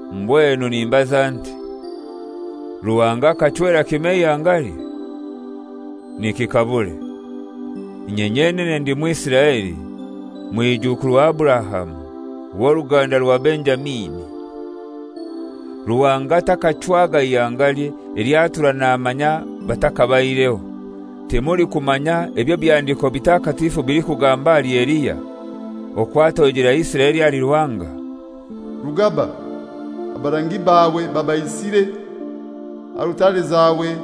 Mbwenu nimbaza nti, Ruhanga akachwera kimoi eihangalye? Nikikabure! Inye nyenene ndi Mwisiraeli, mwijukuru wa Aburahamu, w'oruganda rwa Benjamini. Ruhanga takachwaga ihangalye elyo atura namanya batakabaireho. Timulikumanya eby'Ebihandiko Bitakatifu bilikugamba ahali Eliya, okwo atoijera Isiraeli ahali Ruhanga? «Rugaba, abarangi baawe babaisire, alutare zawe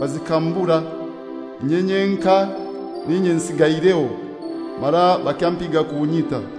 bazikambura, inye nyenkai n'inye nsigaireho, mara bakyampiga kunyita.»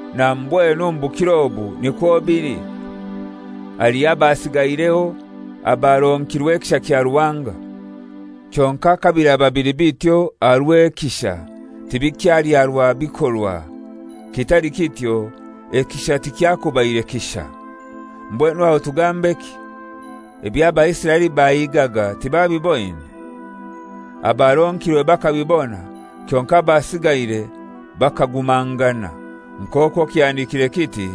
Na mbwenu omu bukiro obu nikwo bili; haliho abasigaireho abaronkirwe ekisha kya Ruhanga. Kyonkai kabiraba bili bityo aha rw'ekisha tibikyali aha rwa bikorwa; kitali kityo ekisha tukyakubaire kisha. Mbwenu aho tugambeki? Ebyo Abaisiraeli bahigaga tibabiboine. Abaronkirwe bakabibona, kyonkai abasigaire bakagumangana, nk'okwo kihandikirwe kiti,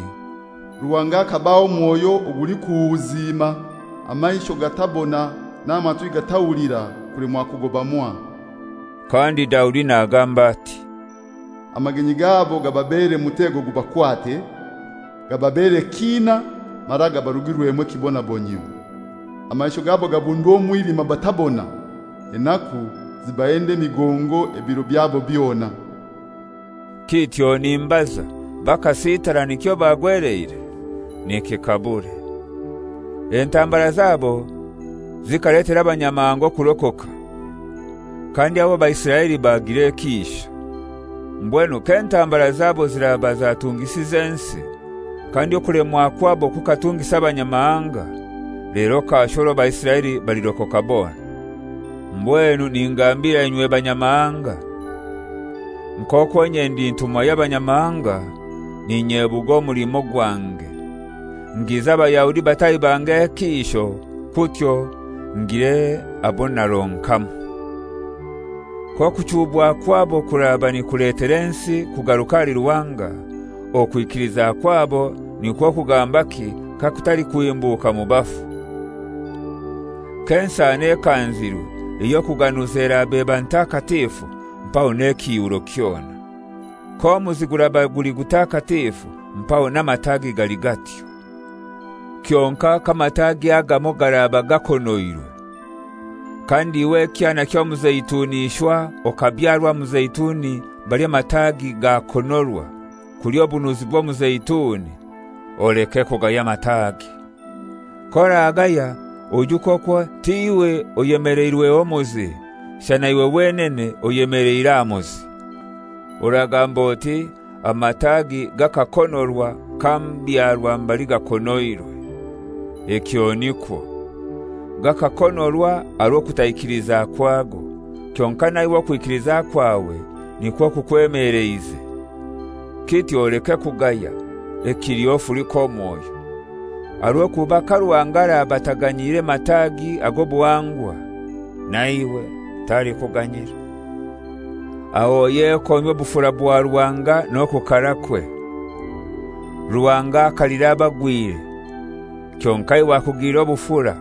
«Ruhanga akabaha omwoyo ogulikuhuziima, amaisho gatabona n'amatwi gatahulira kulemwa kugoba mwaha.» Kandi Daudi nagamba ati, «Amagenyi gabo gababeere mutego gubakwate, gababeere kiina mara gabarugirwemu ekibonabonyio; amaisho gabo gabundwe omwilima batabona, enaku zibahende emigongo ebiro byabo byona.» Kityo nimbaza, bakasitara nikyo bagweleire? Nikikabure. Entambara zabo zikaletera Abanyamahanga okurokoka, kandi aho Abaisiraeli bagira ekiisho. Mbwenu k'entambara zabo ziraba zatungisize ensi, kandi okulemwa kwabo kukatungisa Abanyamahanga, lero kasho orwo Abaisiraeli balirokoka bona! Mbwenu ningambira inywe Banyamahanga. Nk'okwo inye ndi ntumwa y'Abanyamahanga, n'inyebuga omulimo gwange ngize Abayahudi bataahi bange ekiisho, kutyo ngire abo naronkamu. K'okuchuubwa kwabo kuraba nikuletera ensi kugaruka ahali Ruhanga, okwikiliza kwabo nikwo kugambaki kakutali kuhimbuka mu bafu? K'ensano ekanzirwe ey'okuganuza eraba eba ntakatifu, mpaho n'ekiihuro kyona; k'omuzi guraba guli gutakatifu, mpaho n'amatagi gali gatyo. Kyonkai k'amatagi agamoi garaba gakonoirwe, kandi iwe ekyana ky'omuzeituni ishwa okabyarwa aha muzeituni mbali amatagi gakonorwa, kulya obunuzi bw'omuzeituni, oleke kugaya amatagi. K'oragaya oijuke okwo t'iwe oyemeleirweho muzi, shana iwe wenene oyemeleire aha muzi. Oragamba oti, «Amatagi gakakonorwa kambyarwa mbali gakonoirwe.» Ekyo nikwo. Gakakonorwa aha rw'okutaikiliza kwago, kyonkai naiwe okwikiliza kwawe nikwo kukwemeleize. Kityo oleke kugaya, ekiliho ofulike omwoyo. Aha rw'okuba ka Ruhanga araba ataganyiire mataagi ag'obuhangwa, naiwe talikuganyira. Aho oyekomye obufura bwa Ruhanga n'okukarakwe: Ruhanga akalira abagwire, kyonkai iwe akugilira obufura,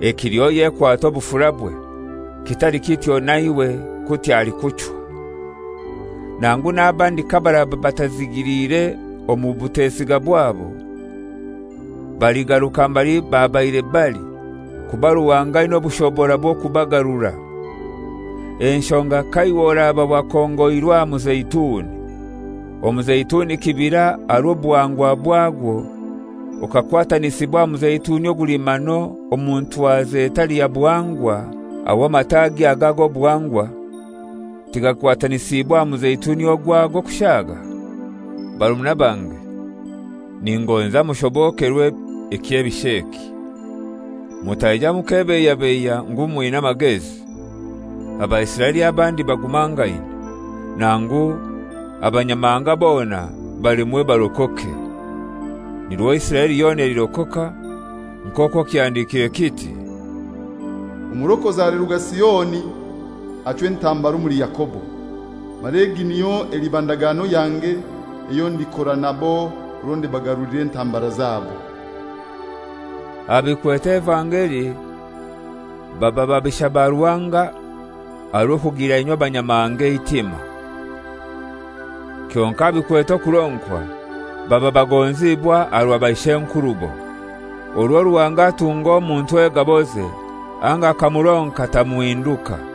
ekiliho oyekwate obufurabwe; kitali kityo naiwe kutyo alikuchwa. Nangu n'abandi kabaraba batazigiliire omu butesiga bwabo, baligaruka mbali babaire bali, kuba Ruhanga aina obushobora bw'okubagarura. Enshonga ka iwe oraba wakongoirwe aha muzeituni, omuzeituni kibira aha rw'obuhangwa bwagwo, okakwatanisibwa aha muzeituni ogulimano omu ntwaza etali ya buhangwa, aho amatagi aga ag'obuhangwa tigakwatanisiibwe aha muzeituni ogwago kushaaga? Barumuna bange, ningonza mushobokerwe ekyebisho eki, mutaija mukebeiyabeiya ngu mwina amagezi. Abaisiraeli abandi bagumangaine, nangu Abanyamahanga bona balemwe barokoke, nirwo Isiraeli yona elirokoka; nk'okwo kihandikire kiti: «Omurokozi aliruga Sioni, achwe entambara omuli Yakobo; mara egi niyo eliba ndagano yange eyo ndikora nabo orwo ndibagarulira entambara zabo.» Aha bikwete evangeli baba babisha ba Ruhanga aha rw'okugilira inywe Abanyamahanga eitima. Kyonkai aha bikwete okuronkwa baba bagonzibwa aha rwa baishenkurubo. Orwo Ruhanga atunga omuntu egaboze anga akamuronka tamuhinduka.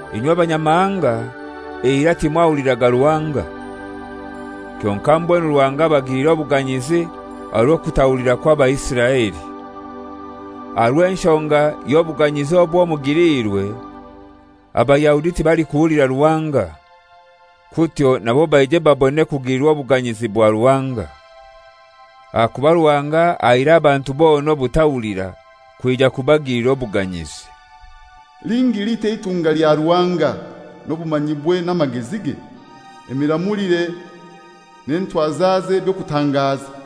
Inywe Abanyamahanga, eirai timwahuliraga Ruhanga. Kyonkai mbwenu Ruhanga abagilire obuganyizi aha rw'okutahulira kwa Baisiraeli. Aha rw'enshonga y'obuganyizi obwo mugiliirwe, Abayahudi tibalikuhulira Ruhanga, kutyo nabo baije babone kugilirwa obuganyizi bwa Ruhanga. Ahakuba Ruhanga ahaire abantu bona obutahulira, kwija kubagilira obuganyizi. Lingi litai eitunga lya Ruhanga n'obumanyibwe n'amagezige! Emiramulire n'entwazaze by'okutangaza!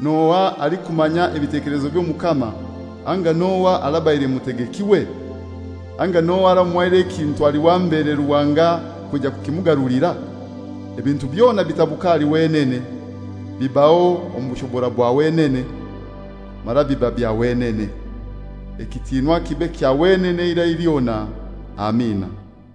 «N'ohai alikumanya ebitekelezo by'Omukama anga n'ohai arabaire mutegekiwe? Anga n'ohai aramuhaire ekintu ali wa mbere Ruhanga kwija kukimugarulira?» Ebintu byona bitabuka ahali wenene, bibaho omu bushobora bwa wenene, mara biba bya wenene. Ekitiinwa kibe kya wenene eirai lyona. Amina.